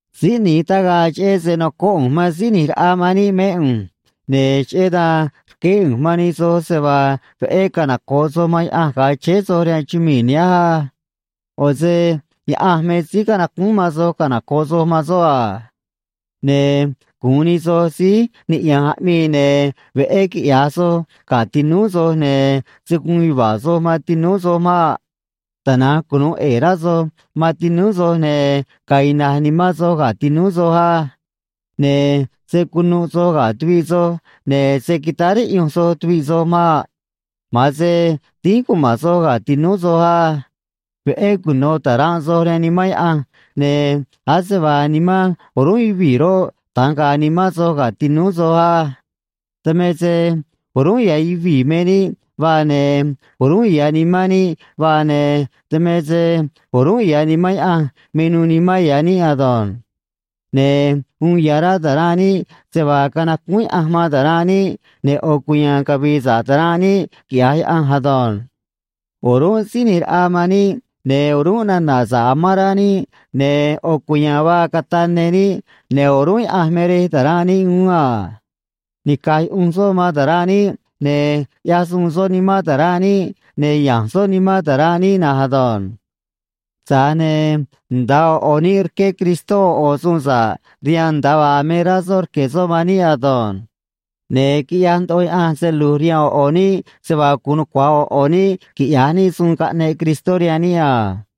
Síí ꞌni̱j tagaꞌ cheꞌé se nocóꞌ ꞌu̱nj man Síí ꞌNi̱j Raꞌa man níꞌ mé ꞌu̱nj, ne̱ cheꞌé dan rqueé ꞌu̱nj man nij soj se vaa veꞌé canoco̱ꞌ soj man Yaꞌanj ga̱a chéé soj rihaan chumii̱ nihánj á. ꞌO̱ se Yaꞌanj me síí canacúún man soj canoco̱ꞌ soj man soꞌ a. Ne̱ gu̱un nij soj síí niꞌya̱nj aꞌmii, ne̱ veꞌé quiꞌya̱j soj ga̱ tinúú soj, ne̱ se̱ guun yuva̱a̱ soj man tinúú soj maꞌ. Tana̱nj cunu̱u ꞌe̱e̱ rá soj man tinúú soj, ne̱ ga̱a̱ ina̱j nimán soj ga̱ tinúú soj á. Ne̱ se̱ cunuꞌ soj ga̱ tuviꞌ soj, ne̱ se̱ quitáá riꞌyunj soj tuviꞌ soj maꞌ. Ma̱an se dínj cuma̱n soj ga̱ tinúú soj á. Veꞌé cuno̱ ta̱ranꞌ soj rihaan Nimán Yaꞌanj, ne̱ ase vaa nimán o̱rúnꞌ yuvii̱ roꞌ, da̱nj ga̱a̱ nimán soj ga̱ tinúú soj á. Dan me se o̱rúnꞌ ya̱ yuvii̱ me níꞌ vaa, ne̱ o̱rúnꞌ ya̱ nimán níꞌ vaa, ne̱ dan me se o̱rúnꞌ ya̱ Nimán Yaꞌanj me nuû nimán ya̱ níꞌ ado̱nj. Ne̱ uun ya̱ rá ta̱ranꞌ níꞌ se vaa canacúún Yaꞌanj man ta̱ranꞌ níꞌ, ne̱ ꞌo̱ cuya̱a̱n cavi̱i̱ sa̱ꞌ ta̱ranꞌ níꞌ, quiꞌya̱j Yaꞌanj ado̱nj. O̱rúnꞌ Síí ꞌNi̱j Raꞌa man níꞌ, ne̱ o̱rúnꞌ nana̱ sa̱ꞌ amán rá níꞌ, ne̱ ꞌo̱ cuya̱a̱n vaa cataꞌ ne níꞌ, ne̱ o̱rúnꞌ Yaꞌanj me Rej ta̱ranꞌ níꞌ uún a. Nica̱j yuꞌunj soꞌ man ta̱ranꞌ níꞌ, ne̱ ꞌyaj suun soꞌ nimán ta̱ranꞌ níꞌ, ne̱ ya̱nj soꞌ nimán ta̱ranꞌ níꞌ na̱nj ado̱nj. Tza̱j ne̱ nda̱a ꞌo̱ ꞌo̱ níꞌ rqué Cristó ꞌo̱ ꞌo̱ suun sa̱ꞌ rihaan, nda̱a vaa me rá soꞌ rque̱ soꞌ man níꞌ ado̱nj. Ne̱ quiꞌyaj ndoꞌo Yaꞌanj se lu̱j rihaan ꞌo̱ ꞌo̱ níꞌ se vaa guun nucua̱j ꞌo̱ ꞌo̱ níꞌ quiꞌya̱j níꞌ suun caꞌneꞌ Cristó rihaan níꞌ a.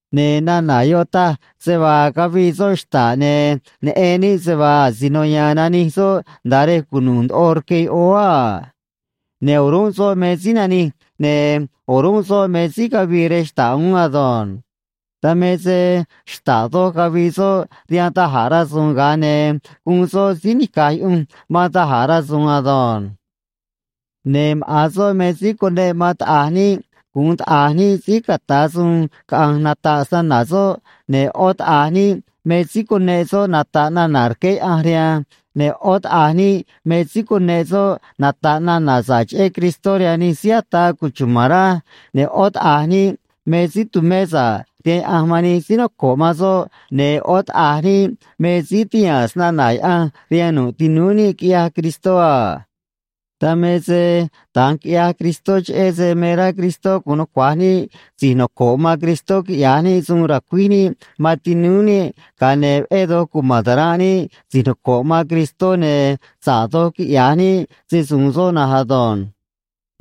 Ne̱ nana̱ yoꞌ taj se vaa cavii soꞌ xta̱ꞌ, ne̱ neꞌen níꞌ se vaa asino ya̱a̱n nanij soꞌ nda̱a rej cunu̱u̱ doj rque yoꞌóó a. Ne̱ o̱rúnꞌ soꞌ me síí nanij, ne̱ o̱rúnꞌ soꞌ me síí cavii rej xta̱ꞌ uún ado̱nj. Dan me se xta̱ꞌ doj cavii soꞌ rihaan da̱j a̱ rasu̱u̱n, ga̱a ne̱ guun soꞌ síí nica̱j yuꞌunj man da̱j a̱ rasu̱u̱n ado̱nj. Ne̱ maꞌa̱n soꞌ me síí cuneꞌ man taꞌa̱j níꞌ gu̱un taꞌa̱j níꞌ síí ca̱ta̱ suun caꞌa̱nj nata̱ꞌ snana̱ soꞌ, ne̱ ꞌó taꞌa̱j níꞌ me síí cuneꞌ soꞌ nata̱ꞌ nana̱ rqué Yaꞌanj rihaan, ne̱ ꞌó taꞌa̱j níꞌ me síí cuneꞌ soꞌ nata̱ꞌ nana̱ sa̱ꞌ cheꞌé Cristó rihaan nij síí ataa cuchuma̱n rá, ne̱ ꞌó taꞌa̱j níꞌ me síí tumé sa̱ꞌ rihaan Yaꞌanj man nij síí noco̱ꞌ man soꞌ, ne̱ ꞌó taꞌa̱j níꞌ me síí tihaa̱n snana̱ Yaꞌanj rihaan nu̱ꞌ tinúú níꞌ, quiꞌyaj Cristó a. Dan me se da̱nj quiꞌyaj Cristó, cheꞌé se me rá Cristó gu̱un nucua̱j níꞌ si̱j noco̱ꞌ man Cristó quiꞌya̱j níꞌ suun ra̱cuíj níꞌ man tinúú níꞌ, ga̱a ne̱ veꞌé doj cuma̱n ta̱ranꞌ níꞌ si̱j noco̱ꞌ man Cristó, ne̱ sa̱ꞌ doj quiꞌya̱j níꞌ se‑su̱u̱n soꞌ na̱nj ado̱nj.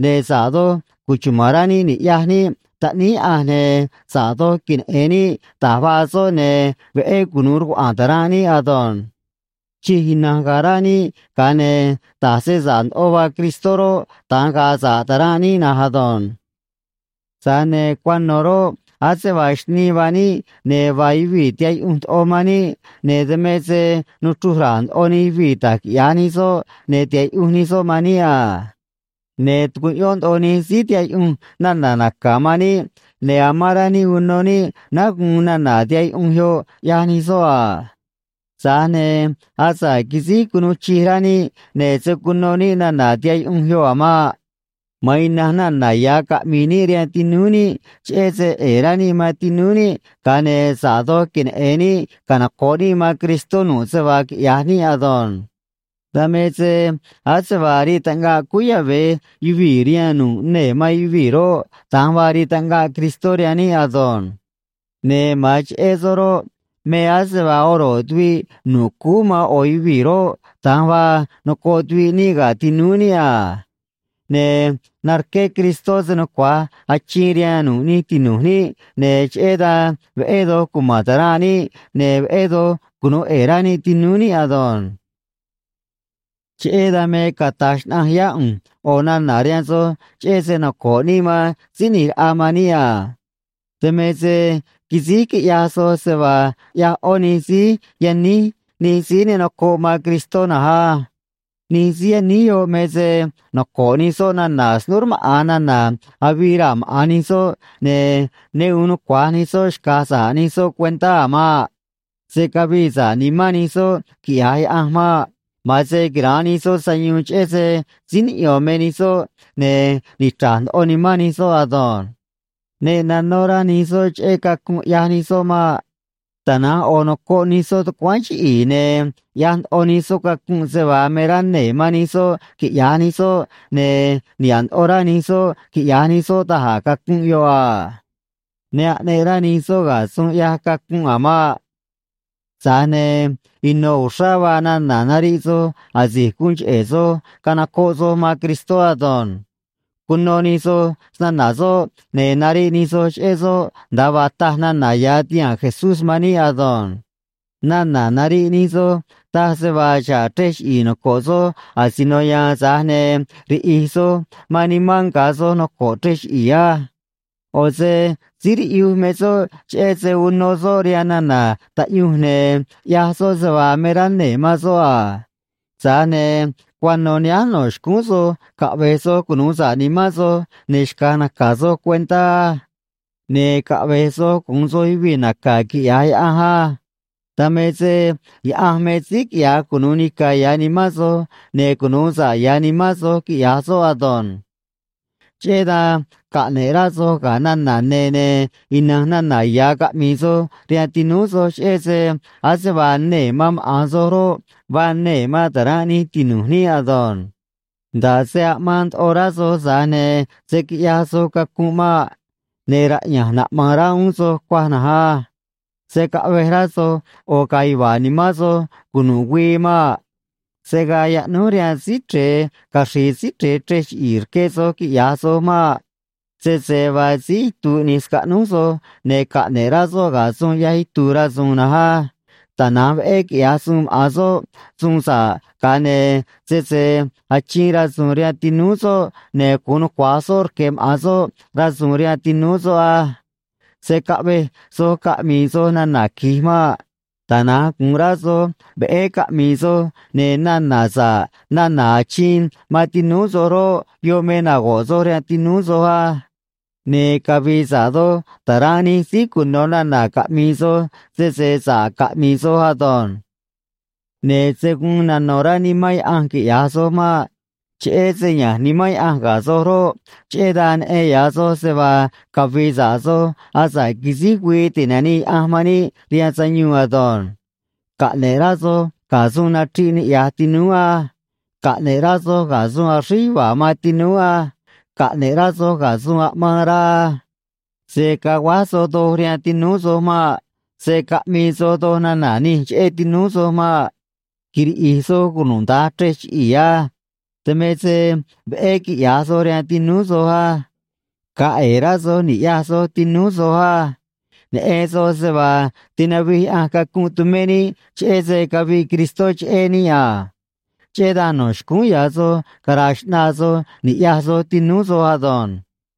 Ne̱ sa̱ꞌ doj cuchuma̱n rá níꞌ ni̱ꞌyaj níꞌ Taꞌníí Yaꞌanj, ne̱ sa̱ꞌ doj queneꞌe̱n níꞌ da̱j vaa soꞌ, ne̱ veꞌé cunu̱u rcuaꞌa̱a̱n ta̱ranꞌ níꞌ ado̱nj. Chij ina̱nj ga̱a̱ rá níꞌ, ga̱a ne̱ da̱j se sa̱ꞌ ndoꞌo vaa Cristó roꞌ, da̱nj ga̱a̱ sa̱ꞌ ta̱ranꞌ níꞌ na̱nj ado̱nj. Tza̱j ne̱ cuano̱ roꞌ, ase vaa xnii vaa níꞌ, ne̱ vaa yuvii̱ tihaꞌ yuꞌunj ndoꞌo man níꞌ, ne̱ dan me se nuchruj ra̱a̱ ndoꞌo nij yuvii̱ da̱j quiꞌya̱j nij soꞌ, ne̱ tihaꞌ yuꞌunj nij soꞌ man níꞌ a. Ne̱ tucuꞌyón ndoꞌo nij síí tihaꞌ yuꞌunj nana̱ naca̱ man níꞌ, ne̱ amán rá níꞌ uno níꞌ náá guun nana̱ tihaꞌ yuꞌunj yoꞌ, ꞌyaj nij soꞌ a. Tza̱j ne̱ asa̱ꞌ quisíj cunuu chij rá níꞌ, ne̱ se̱ cuno níꞌ nana̱ tihaꞌ yuꞌunj yoꞌ a̱ maꞌ. Ma̱an ina̱nj nana̱ ya̱ caꞌmi̱i̱ níꞌ rihaan tinúú níꞌ, cheꞌé se ꞌe̱e̱ rá níꞌ man tinúú níꞌ, ga̱a ne̱ sa̱ꞌ doj queneꞌe̱n níꞌ canoco̱ꞌ níꞌ man Cristó nu̱ꞌ se vaa quiꞌya̱j níꞌ ado̱nj. Dan me se ase vaa rii taꞌngaꞌ cúú yave̱ yuvii̱ rihaan nu̱ꞌ nee̱ man yuvii̱ roꞌ, da̱nj vaa rii taꞌngaꞌ Cristó rihaan níꞌ ado̱nj. Ne̱ ma̱an cheꞌé soꞌ roꞌ, me ase vaa oro̱ꞌ tuviꞌ nu̱ꞌ cúú man ꞌo̱ yuvii̱ roꞌ, da̱nj vaa nocoꞌ tuviꞌ níꞌ ga̱ tinúú níꞌ a. Ne̱ narqué Cristó se nucua̱j achiin rihaan nu̱ꞌ nij tinu̱j níꞌ, ne̱ cheꞌé dan veꞌé doj cuma̱n ta̱ranꞌ níꞌ, ne̱ veꞌé doj cunu̱u ꞌe̱e̱ rá níꞌ tinúú níꞌ ado̱nj. Cheꞌé dan me cata̱j xnaꞌanj yá ꞌu̱nj ꞌo̱ nana̱ rihaan soj, cheꞌé se noco̱ꞌ níꞌ man Síí ꞌNi̱j Raꞌa man níꞌ a. Dan me se quisíj quiꞌyaj soj se vaa ꞌyaj ꞌó nij síí yaníj nij síí ne nocoꞌ man Cristó na̱nj á. Nij síí yaníj yoꞌ me se noco̱ꞌ nij soꞌ nana̱ snúú rmaꞌa̱n nana̱ avii raa̱ maꞌa̱n nij soꞌ, ne̱ ne uun nucua̱j nij soꞌ xca̱j sa̱ꞌ nij soꞌ cuentá a̱ maꞌ. Se̱ cavii sa̱ꞌ nimán nij soꞌ, quiꞌya̱j Yaꞌanj maꞌ. Ma̱an se quira̱nꞌ nij soꞌ sayuun cheꞌé se síí niꞌyo̱n me nij soꞌ ne̱ nichra̱j ndoꞌo nimán nij soꞌ ado̱nj. Ne nanó rá nij soꞌ cheꞌé cacunꞌ ꞌyaj nij soꞌ maꞌ. Tana̱nj ꞌo̱ nocoꞌ nij soꞌ tucuáán chiꞌi̱i̱, ne̱ ꞌyaj ndoꞌo nij soꞌ cacunꞌ se vaa me rá nee̱ man nij soꞌ quiꞌya̱j nij soꞌ, ne̱ niha̱ꞌ ndoꞌo rá nij soꞌ quiꞌya̱j nij soꞌ da̱j a̱ cacunꞌ yoꞌ a. Ne aꞌneꞌ rá nij soꞌ ga̱ suun ꞌyaj cacunꞌ a̱ maꞌ. Tza̱j ne̱ ino̱ uxrá vaa nana̱ nariꞌ soj asi̱j guun cheꞌe̱ soj canocoꞌ soj man Cristó ado̱nj. Cuno nij soj snana̱ soꞌ, ne̱ nariꞌ nij soj cheꞌé soꞌ nda̱a vaa taj nana̱ ya̱ tihaa̱n Jesús man níꞌ ado̱nj. Nana̱ nariꞌ nij soj taj se vaa xa̱ꞌ chrej chiꞌi̱i̱ noco̱ꞌ soj asino ya̱a̱n, tza̱j ne̱ riꞌi̱j soj man nimán nga̱ soj noco̱ꞌ chrej chiꞌi̱i̱ á. ꞌO̱ se síí riꞌyuj me soꞌ cheꞌé se uno soꞌ rihaan nana̱ taꞌyunj ne̱ ꞌyaj soꞌ se vaa me rá nee̱ man soꞌ a. Tza̱j ne̱ cuano̱ nihánj no̱ xcúún soj caꞌve̱j soj cunu̱u sa̱ꞌ nimán soj, ne̱ xca̱j naca̱ soj cuentá á. Ne̱ caꞌve̱j soj gu̱un soj yuvii̱ naca̱ quiꞌya̱j Yaꞌanj á. Dan me se Yaꞌanj me síí quiꞌya̱j cunu̱u nica̱ ya̱ nimán soj, ne̱ cunu̱u sa̱ꞌ ya̱ nimán soj, quiꞌya̱j soꞌ ado̱nj. Cheꞌé dan caꞌne̱ꞌ rá soj ga̱ nana̱ ne̱, ne̱ ina̱nj nana̱ ya̱ caꞌmi̱i̱ soj rihaan tinúú soj, cheꞌé se ase vaa nee̱ man maꞌa̱n soj roꞌ, vaa nee̱ man ta̱ranꞌ nij tinu̱j níꞌ ado̱nj. Nda̱ꞌ se aꞌmaan ndoꞌo rá soj, tza̱j ne̱ se̱ quiꞌyaj soj cacunꞌ maꞌ. Ne̱ raꞌya̱nj naꞌma̱a̱n rá uún soj cuaj na̱nj á. Se̱ caꞌvej rá soj ꞌo̱ ga̱a̱ yuva̱a̱ nimán soj cunu̱ꞌ güii maꞌ. Se̱ gaa yaꞌnúj rihaan Síí Chre̱e caxri̱i̱ Síí Chre̱e chrej chiꞌi̱i̱ rque soj, quiꞌya̱j soj maꞌ. Sese vaa síí itu̱u̱ ꞌni̱j scaꞌnúj soj, ne̱ caꞌne̱ꞌ rá soꞌ ga̱ suun ꞌyaj itu̱u̱ rasu̱u̱n na̱nj á. Tana̱nj veꞌé quiꞌya̱j suun maꞌa̱n soꞌ suun sa̱ꞌ, ga̱a ne̱ sese achiin rasu̱u̱n rihaan tinúú soꞌ, ne̱ gu̱un nucua̱j soꞌ rque̱ maꞌa̱n soꞌ rasu̱u̱n rihaan tinúú soꞌ á. Se̱ caꞌvej soj caꞌmi̱i̱ soj nana̱ qui̱j maꞌ. Tana̱nj gu̱un rá soj veꞌé caꞌmi̱i̱ soj, ne̱ nana̱ sa̱ꞌ nana̱ achiin man tinúú soj roꞌ, yoꞌ me nago̱ꞌ soj rihaan tinúú soj á. Ne̱ cavi̱i̱ sa̱ꞌ doj ta̱ranꞌ nij síí cuno̱ nana̱ caꞌmi̱i̱ soj, sese sa̱ꞌ caꞌmi̱i̱ soj ado̱nj. Ne̱ se̱ guun nano̱ rá Nimán Yaꞌanj, quiꞌya̱j soj maꞌ. Cheꞌé se ya̱nj Nimán Yaꞌanj ga̱ soj roꞌ, cheꞌé dan neꞌen ya̱ soj se vaa cavi̱i̱ sa̱ꞌ soj asa̱ꞌ quisíj güii ti̱nanii Yaꞌanj man níꞌ rihaan sayuun ado̱nj. Caꞌne̱ꞌ rá soj ga̱ suun nachriꞌ niꞌya̱j tinúú á. Caꞌne̱ꞌ rá soj ga̱ suun axríj yuva̱a̱ man tinúú á. Caꞌne̱ꞌ rá soj ga̱ suun aꞌmaan rá á. Se̱ caguáj soj doj rihaan tinúú soj maꞌ. Se̱ caꞌmii soj doj nana̱ nij cheꞌé tinúú soj maꞌ. Quiriꞌi̱j soj cunuda̱nj chrej chiꞌi̱i̱ á. Dan me se veꞌé quiꞌya̱j soj rihaan tinúú soj á. Ga̱a̱ ꞌe̱e̱ rá soj ni̱ꞌyaj soj tinúú soj á. Neꞌen soj se vaa tinavij Yaꞌanj cacunꞌ tumé níꞌ, cheꞌé se caviꞌ Cristó cheꞌé níꞌ a. Cheꞌé dan no̱ xcúún ya̱ soj cara̱a̱ xꞌnaa soj ni̱ꞌyaj soj tinúú soj ado̱nj.